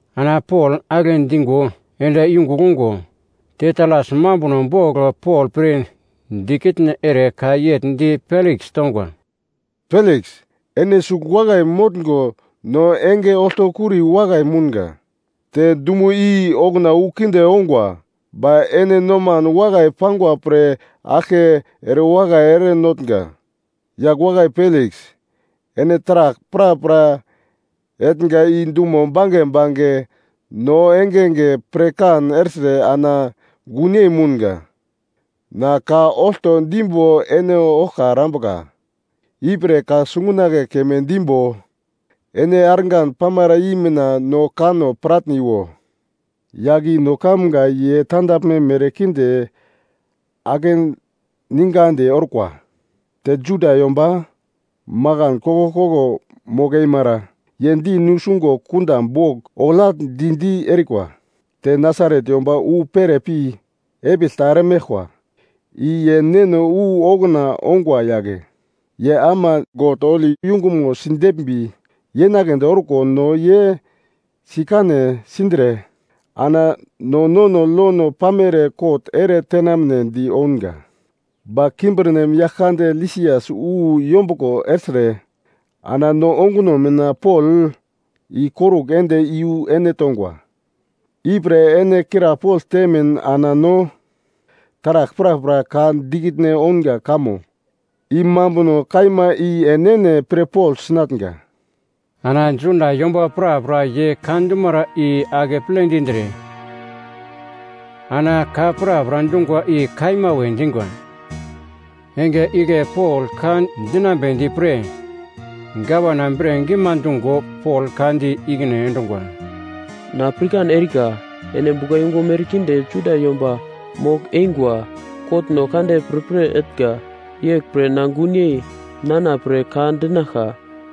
Ana Pol agle dingo ende yungugl ungo, Tetalas mambuno bogl Pol pre dikitne ere ka yegl di Peliks tongwa, “Peliks, ene sugl wakai motngo no enge oltokuri wakai mounga, te dumo i okuna wu kinde ongwa, ba ene noman wakai pangwa pre aglke erewakai erenotnga. Yagl wakai Peliks, ene taragl prapra etnga i dumo bange bange no engenge pirkan ertre ana gunyei mounga. Na ka olto dimbo ene oglka erambuka, ipre ka sungunagle keme dimbo ene argan pamara i mina no kanno piratniwa. “Yagl i no kamga ye tandaglme merkinde akeningandi orkwa. Te Juda yomba makan koglkoglo mogl-emara ye di nusungo kunda bogl oglagl di-di erikwa. Te Nasaret yomba wu pere pi epigl ta eremeglkwa i ye neno wu okuna ongwa yagle. Ye ama God holi yungumo sideglmbi yenaglendi orko no ye sikane sindre ana no nono lono pamere kot ere tenamnedi ounga, ba kimbirnem yagl kande Lisias wu yombuglo ertre ana no onguno mina Pol ikorugl ende iyu ene tongwa. Ipre ene krapogl temin ana no taragl prapra ka dikitne ounga kamo i mambuno kaima i enene pirpogl sinatnga.” Ana Juda yomba prapra ye ka dumara i akeple dindre ana ka prapra dungwa i kaima we dingwa. Enge igle Pol ka dinambedi pre gavana bre gima dungo Pol ka di ikine endungwa, “Na pirkan erika ene buglayungu merkinde Juda yomba mogl-eingwa kotno kande pirpir etnga, yeglpre na gunyei nana pre ka dinaglka.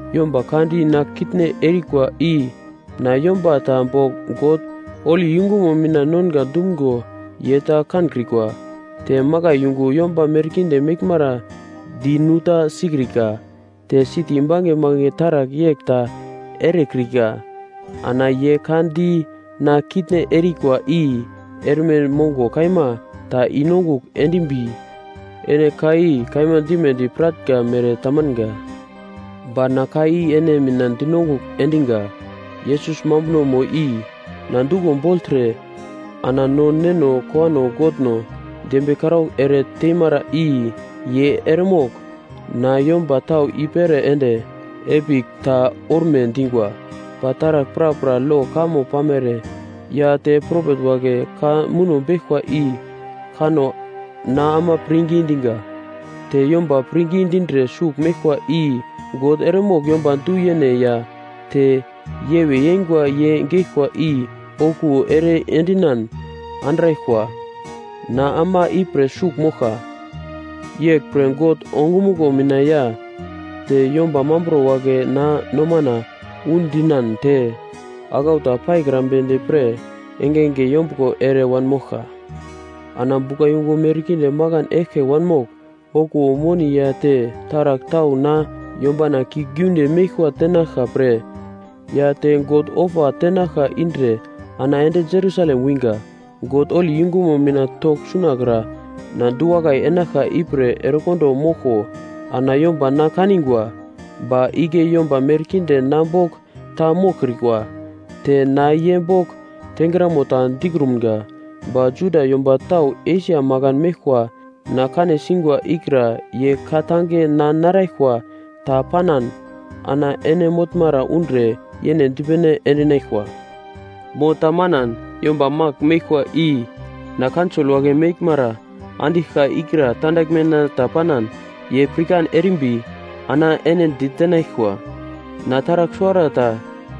Yomba ka di na kitne erikwa i na yomba ta bogl God holi yungumo mina nonga dumgo ye ta kankrikwa, te makai yungu yomba merkinde meglmara di nu ta sikrika, te siti bange bange taragl yegl ta erekrika. Ana ye ka di na kitne erikwa i erme mongo kaima ta i-nongugl endimbi ene ka i kaima dimedi piratnga mere tamanga. Ba na ka i ene mina dinongugl endinga, Yesus Mambunomo i na duglo bogltre ana no neno kowano Godno dembiye karaugl ere teimara i ye eremogl na yomba tau i-pere ende epigl ta orme dingwa. Ba taragl prapra lo kamo pamere ya te propet wagle ka muno beglkwa i kanno na ama pirngi dinga. Te yomba pirngi dindre sugl meglkwa i God eremogl yomba du-yene ya te yewe yengwa ye geglkwa i okuwo ere endinan andraglkwa, na ama ipre sugl moglka. Yeglpre God ongumuglo mina ya te yomba mambro wagle na nomana undinan te aglau ta paikrambedi pre engenge yombuglo ere wanmoglka. “Ana buglayungu merkinde makan eglke wanmogl okuwo moni ya te taragl tau na yombana kiuglgiunde meglkwa tenaglka pre ya te God ofa tenaglka indre ana ende Jerusalem wingwa. God holi yungumo mina togl sunakra na du-wakai enaglka ipre erekondo moglko ana yomba na kanigwa. Ba igle yomba merkinde na bogl ta moglkrikwa, te na ye bogl tengramo ta dikrumga. Ba Juda yomba tau Esia makan meglkwa na kane singwa ikra ye ka-tange na naraglkwa ta panan ana ene motnara undre yene dipene endinaglkwa. Mo ta manan, yomba magl meglkwa i na Kaunsol wagle meglmara andiglka ikra tandaglmena ta panan ye pirkan erimbi ana ene ditenaglkwa. Na taragl suwarata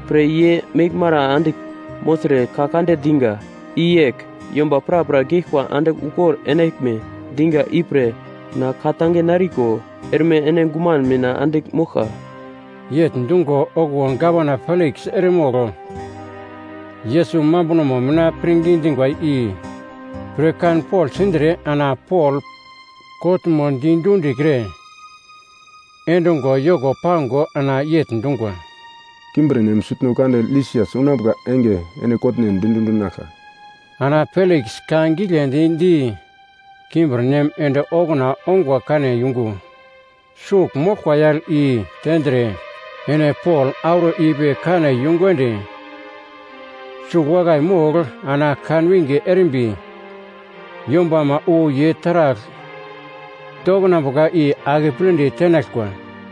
pre ye meglmara andigl mogltre ka kande dinga, i yegl, ‘Yomba prapra geglkwa andigl ukor enaglme dinga ipre na ka-tange nariko erme ene guman mina andigl moglka.’” Yegl dungo okuwo Gavana Peliks eremogl Yesus Mambunomo mina pirngi dingwa i pirkanpogl sindre ana Pol kotmo di dundikre endungo yoko pango ana yegl dungwa, “Kimbirnem sutno kande Lisias unambuka enge ene kotnen di dundinaglka.” Ana Peliks ka giglendi di kimbirnem ende okuna ongwa kane yungu sugl moglkwa yagl i tendre ene Pol auro ipi kane yungu ende sugl wakai mogl ana kanwinge erimbi yombama wu ye taragl doknambuka i akepledi tenaglkwa.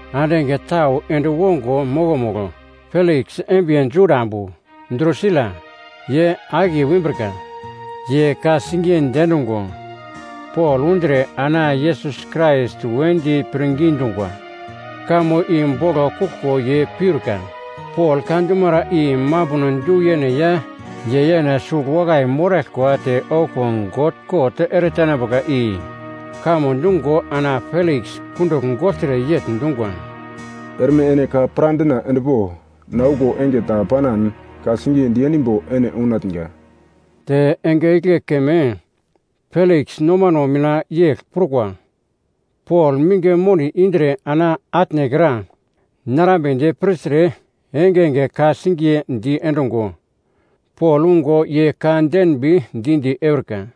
Ande enge tau ende wongo mokomugl, Peliks embiye Juda ambu, Drusila, ye akiye wimbrika. Ye ka-singiye diendungo Pol undre ana Yesus Krais wedi pirngi dungwa kamo i boglo kuglko ye piurka. Pol ka dumara i mambuno du-yene ya ye yene sugl wakai moraglkwa te okuwo God kot eretenambuka i kamo dungo ana Peliks kundugl gogltre yegl dungwa, “Erme ene ka pradina endpo! Na okuwo enge ta panan ka-singiye diendimbo ene unatnga.” Te enge igle keme Peliks nomano mina yegl prukwa: Pol minge moni indre ana atnekra narambedi pirtre engenge ka-singiye diendungo Pol ungo ye ka denbi di-di eurika.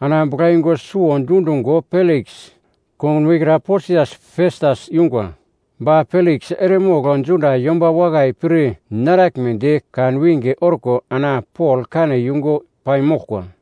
Ana buglayungu suwo dundungo Peliks kongunmo ikra Posias Festas yungwa. Ba Peliks eremogl Juda yomba wakai pir naraglmedi kanwinge orko ana Pol kane yungu paimoglkwa.